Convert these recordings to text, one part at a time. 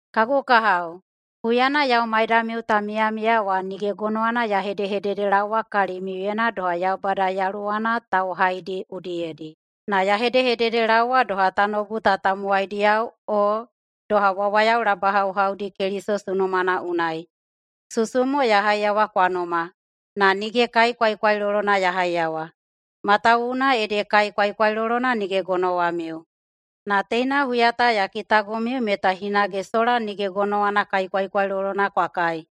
Kagu kahao, huyana yau maidamiu ta miyamiya wa nige gonowana ya hedehededelaowa kalimiuyena doha Yaubada yaluwana tauhaidi udiyedi, na ya hedehededelaowa doha tanoubu ta tamowaidiyao o doha wawayao labahauhaudi Keliso sunumana unai. Susu mo ya haiyawa kwa numa, na nige kai kwaikwailolona ya haiyawa, matawuwuna ede kai kwaikwailolona nige gonowamiu. Na teina huya ta ya kitagomiu meta hinage sola nige gonowana kai kwaikwailolona kwa kai,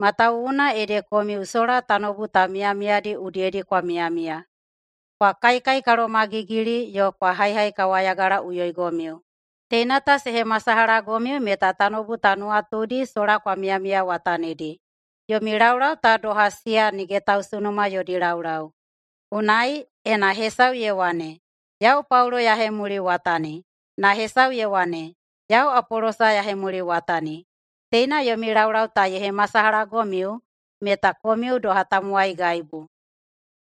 matawuwuna ede komiu sola tanoubu ta miyamiyadi udiyedi kwa miyamiya. Kwa kaikaikalomagigili yo kwa haihaikawayagalaꞌuyoigomiu. Teina ta se hemasalahagomiu meta tanoubu ta nuwatudi sola kwa miyamiyawatanidi. Yomi laulau ta doha siya nige tausunuma yodi laulau. Unai, ena hesau ye wane, “Yau Paulo ya hemuliwatani,” na hesau ye wane, “Yau Apolosa ya hemuliwatani,” teina yomi laulau ta ye hemasalahagomiu meta komiu doha tamowaigaibu.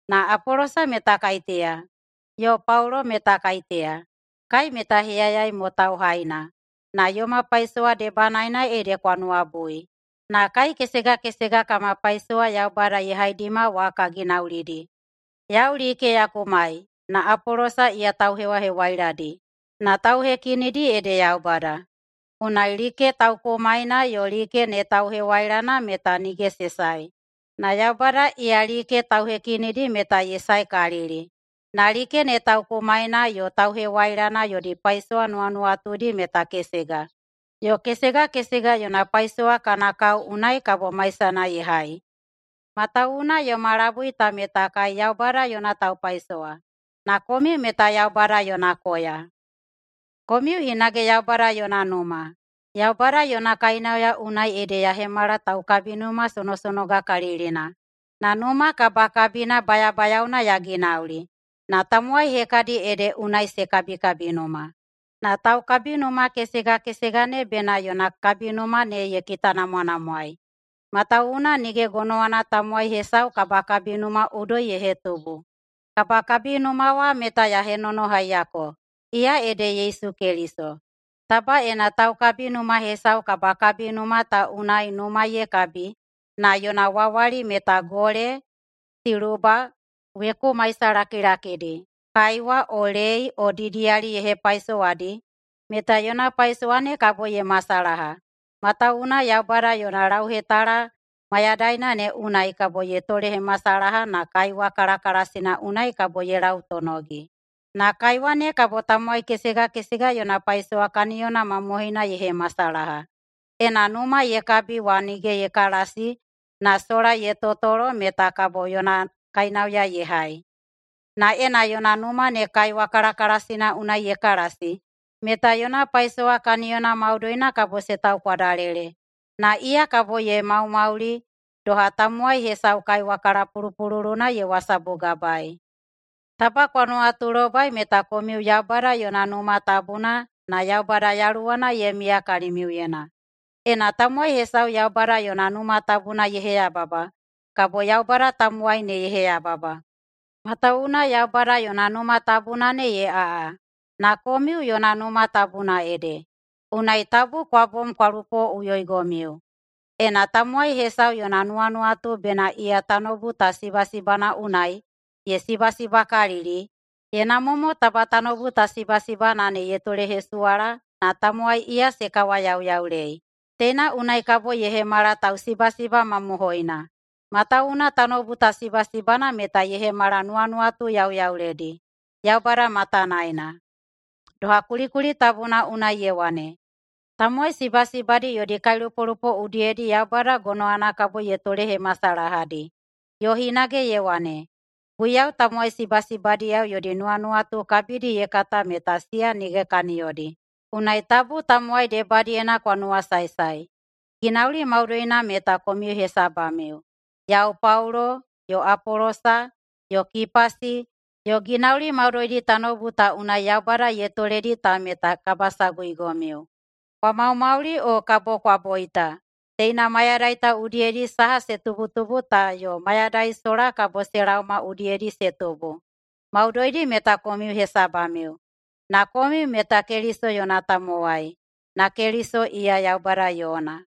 Na Apolosa meta kaiteya, yo Paulo meta kaiteya. Kai meta heyayai mo tauhaina, na yoma paisowa debanaena ede kwa nuwabui. Na kai kesega kesega kama paisowa Yaubada ye haidima wa ka ginaulidi. Yau like ya kumai na Apolosa iya tauhewahewailadi, na tauhekinidi ede Yaubada. Unai like taukumaina yo like ne tauhewailana meta nige se sae, na Yaubada iya like tauhekinidi meta ye saekalili. Na like ne taukumaina yo tauhewailana yodi paisowa nuwanuwatudi meta kesega, yo kesega kesega yona paisowa kana kao unai kabo maisana ye hai. Matawuwuna yoma labui ta meta kai Yaubada yona taupaisowa, na komiu meta Yaubada yona koya. Komiu hinage Yaubada yona numa. Yaubada yona kainauya unai ede ya hemala taukabinuma sonosonogakalilina na numa kabakabina bayabayaona ya ginauli, na tamowai hekadi ede unai se kabikabinuma. Na taukabinuma kesega kesega ne bena yona kabinuma ne ye kitanamwanamwaei. Matawuwuna nige gonowana tamowai hesau kabakabinuma udoi ye hetubu. Kabakabinuma wa meta ya henonohaiyako, iya ede Yesu Keliso. Taba ena taukabinuma hesau kabakabinuma ta unai numa ye kabi na yona wawali meta gole, siluba, weku maisalakilakidi, kaiwa o lei o didiyali ye hepaisowadi, meta yona paisowa ne kabo ye masalaha, matawuwuna Yaubada yona lauhetala mayadaina ne unai kabo ye tolehemasalaha na kaiwa kalakalasina unai kabo ye lautonogi. Na kaiwa ne kabo tamowai kesega kesega yona paisowa kaniyona mamohoina ye hemasalaha. Ena numa ye kabi wa nige ye kalasi na sola ye totolo meta kabo yona kainauya ye hai. Na ena yona numa ne kaiwa kalakalasina unai ye kalasi meta yona paisowa kaniyona maudoina kabo se taukwadalele. Na iya kabo ye maumauli, doha tamowai hesau kaiwa kalapulupululuna ye wasabugabaei. Taba kwa nuwatulobai meta komiu Yaubada yona Numa Tabuna na Yaubada Yaluwana ye miya kalimiuyena. Ena tamowai hesau Yaubada yona Numa Tabuna ye heyababa, kabo Yaubada tamowai ne ye heyababa. Matawuwuna Yaubada yona Numa Tabuna ne ye aꞌa, na komiu yona Numa Tabuna ede. Unai tabu kwa bom kwa lupoꞌuyoigomiu! Ena tamowai hesau yona nuwanuwatu bena iya tanoubu ta sibasibana unai ye sibasibakalili, ye namwa mo taba tanoubu ta sibasibana ne ye tolehesuwala na tamowai iya se kawayauyaulei. Teina unai kabo ye hemala tausibasiba mamohoina. Matawuwuna tanoubu ta sibasibana meta ye hemala nuwanuwatu yauyauledi Yaubada matanaena, doha kulikuli tabuna unai ye wane, “Tamowai sibasibadi yodi kailupolupo udiyedi Yaubada gonowana kabo ye tolehemasalahadi.” Yo hinage ye wane, “Guiyau tamowai sibasibadiyao yodi nuwanuwatu kabidi ye kata meta siya nige kaniyodi.” Unai tabu tamowai debadiyena kwa nuwasaesae. Ginauli maudoina meta komiu hesabamiu: Yau Paulo, yo Apolosa, yo Kipasi, yo ginauli maudoidi tanoubu ta unai Yaubada ye toledi ta meta kabasaguigomiu. Kwa maumauli o kabo kwa boita, teina mayadai ta udiyedi saha se tubutubu ta yo mayadai sola kabo se laoma udiyedi se tubu – maudoidi meta komiu hesabamiu. Na komiu meta Keliso yona tamowai, na Keliso iya Yaubada yona.